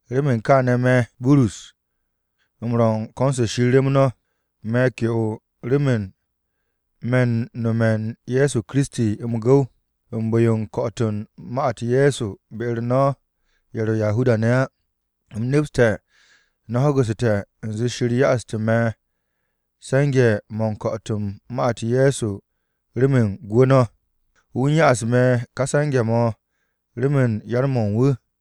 Remen kaane̱, me̱, Burus, u̱m ro̱ u̱n ko̱n-se Shir rem no̱. Me̱ ke'o remen me̱ m-no̱me̱ u̱n Ye̱so Kiristi m-gu̱w, u̱n bu̱-yo u̱n ko̱'o̱t u̱n ma-u̱t Ye̱so be-u̱r no̱ ye̱ ro̱ Yahuda-ne̱ á. U̱m nepste̱ no̱ ho̱gu̱te̱ u̱nze Shir ya'astu̱ me̱ se̱nge̱-mo̱ u̱n ko̱'o̱t u̱n ma-u̱t Ye̱so remen gwu̱ no̱. Wu̱ u̱n ya'as me̱ ka se̱nge̱-mo̱ remen yar-mo̱ u̱n wu̱.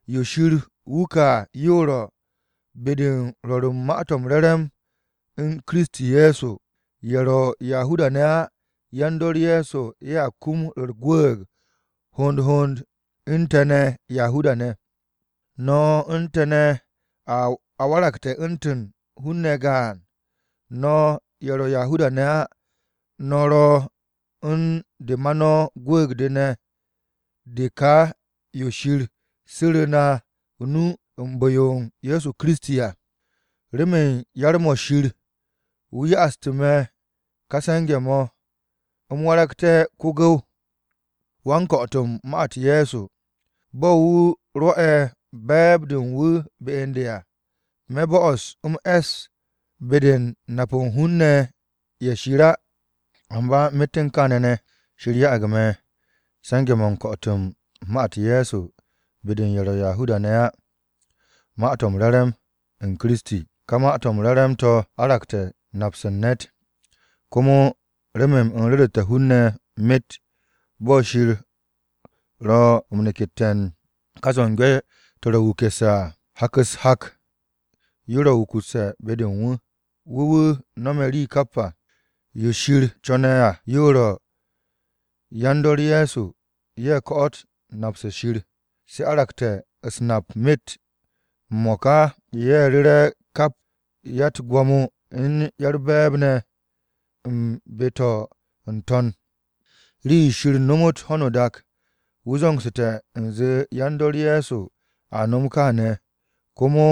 Yo Shir wuke̱ à yo ro̱: be-de u̱n rwo̱r u̱n Ma-to̱ m-Re̱re̱m to̱ ma Kiristi Ye̱so, ye̱ ro̱ Yahuda-ne̱ á, yan-dor Ye̱so ye̱a kum u̱r-gwu̱u̱g hond hond u̱n te̱ ne̱ Yahuda-ne̱. No̱ u̱n te̱ ne̱ a waragte̱ u̱ntu̱n hun-ne̱ gaan. No̱ ye̱ ro̱ Yahuda-ne̱ á no̱ ro̱ u̱n de ma no̱ gwu̱u̱g-de ne̱ de ka yo Shir su̱ru̱ na o-nu u̱n bu̱-o Ye̱so Kiristi à. Remen yar-mo̱ Shir, wu̱ ya'astu̱ me̱ kà se̱nge̱-mo̱, u̱m waragte̱ ko-gu̱w, wan-ko̱'o̱t u̱n ma-u̱t Ye̱so, bo̱ wu̱ rwo̱'e̱ be̱e̱b-de u̱n wu̱ be u̱n de à. Me̱ bo'os u̱m es be-de u̱n kap hun-ne̱ ye̱ Shir á. Amba myet u̱n kaane̱ ne̱, Shir ya'ag me̱ se̱nge̱-mo̱ u̱n ko̱'o̱t u̱n ma-u̱t Ye̱so be-de u̱n ye̱ ro̱ Yahuda-ne̱ á, Ma-to̱ m-Re̱re̱m, u̱n Kiristi. Ka Ma-to̱ m-Re̱re̱m to̱ aragte̱ nap-se u̱n ne̱t. Komo remen u̱m ru̱ru̱te̱ hun-ne̱ myet, bo̱ Shir ro̱ m-nekette̱ u̱n ka zo̱nge̱-to̱ ro̱ wukusse̱ à, hak-u̱s hak yo ro̱ wukusse̱ be-de u̱n wu̱. Wu̱ wu̱ no̱me̱ rii kap à. Yo Shir co̱ne̱ à yo ro̱: yan-dor Ye̱so, ye̱ ko̱'o̱t nap-se Shir, se aragte̱ u̱s-nap myet. M-mo̱ka, ye̱ ru̱re̱ kap ya-u̱t-gwo̱mo u̱n ya-u̱r-be̱e̱b ne̱ u̱n be-to̱ n-to̱n. Rii-yo Shir nomot ho̱no o-dak, wu̱ zo̱ngsu̱te̱ u̱nze yan-dor Ye̱so a nom kaane̱. Komo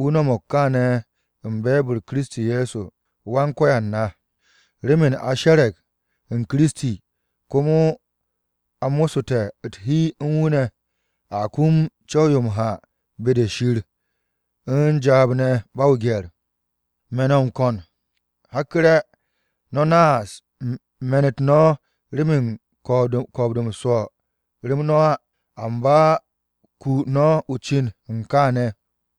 wu̱ no̱mo̱g kaane̱ u̱n be̱e̱b-u̱r Kiristi Ye̱so, Wan-Ko̱yan na. Remen a she̱re̱g u̱n Kiristi, komo a mo̱ssu̱te̱ u̱t-hi u̱n wu̱ ne̱, a kum co̱w-yo m-ha be-de Shir u̱n jaab ne̱ ba o-gye̱r. Me̱ no̱ m-ko̱n, hakku̱re̱, no̱ naas me̱n-u̱t no̱ remen ko̱o̱b-de me̱ m-swo̱ rem no̱ á, amba 'ku no̱ o-cin u̱n kaane̱.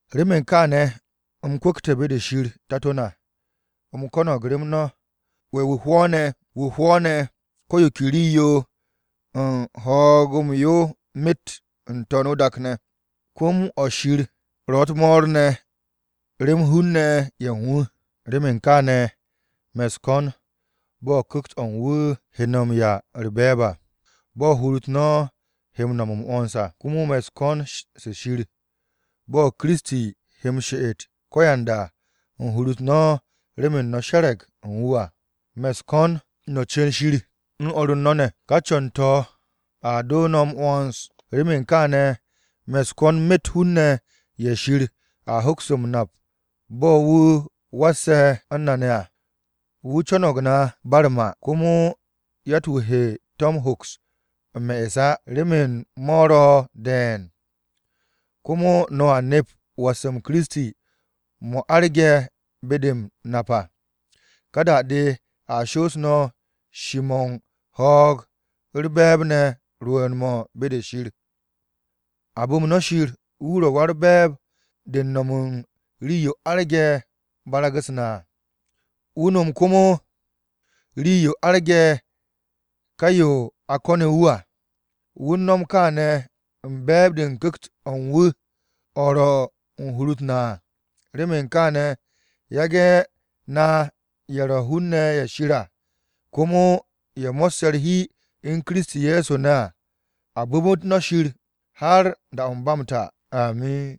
Remen kaane̱, u̱m kwu̱kte̱ be-de Shir Tato na, u̱m ko̱no̱g rem no̱. Wu̱ hwo̱o̱ne̱ ko̱ yo ke rii-yo u̱n ho̱o̱g-yo myet n-To̱n o-dak ne̱. Se̱ps-mo̱ Shir ro̱ u̱t-mo̱o̱r ne̱ remen hun-ne̱ u̱n wu̱. Remen kaane̱, me̱ u̱s-ko̱n bo̱ Ku̱kt-o̱ u̱n wu̱ he no̱ m-'ya u̱r-be̱e̱b à, bo̱ hur-u̱t no̱ he no̱m m-'wo̱ns à. Komo me̱ u̱s-ko̱n se Shir, bo̱ Kiristi he m-she'et ko̱yanda u̱n hur-u̱t no̱ remen no̱ she̱re̱g u̱n wu̱ à. Me̱ u̱s-ko̱n no̱ cu̱n Shir, u̱n o̱r no̱ ne̱. Ká co̱n-to̱ a doo no̱ m-'wo̱ns. Remen kaane̱, me̱ u̱s-ko̱n myet hun-ne̱ ye̱ Shir a hoks m-nap bo̱ wu̱ wasse̱ u̱n na ne̱ à. Wu̱ co̱no̱g na ba u̱r-ma. Komo yatt-wu̱ he to̱ hoks m-me'es á remen mo̱ ro̱ de̱e̱n. Komo no̱a nep was-m Kiristi mo̱ arge̱ be-de m-nap à. Ka da-de a shoos no̱ shi-mo̱ u̱n ho̱o̱g u̱r-be̱e̱b ne̱ rwu̱u̱n-mo̱ be-de Shir. A bu̱m no̱ Shir wu̱ ro̱ Wa-u̱r-Be̱e̱b de u̱n no̱m u̱n rii-yo arge̱ barag-u̱s na à. Wu̱ nom komo rii-yo arge̱ ka yo a ko̱ne̱ wu̱ à. Wu̱ u̱n no̱m kaane̱ u̱n be̱e̱b-de u̱n Ku̱kt-o̱ u̱n wu̱ o̱ ro̱ u̱n hur-u̱t na à. Remen kaane̱, yage̱ na ye̱ ro̱ hun-ne̱ ye̱ Shir à, komo ye̱ mo̱sse̱ u̱r-hi u̱n Kiristi Ye̱so ne̱ à, a bu̱mu̱t no̱ Shir har da-o̱ ba m-ta! Amin!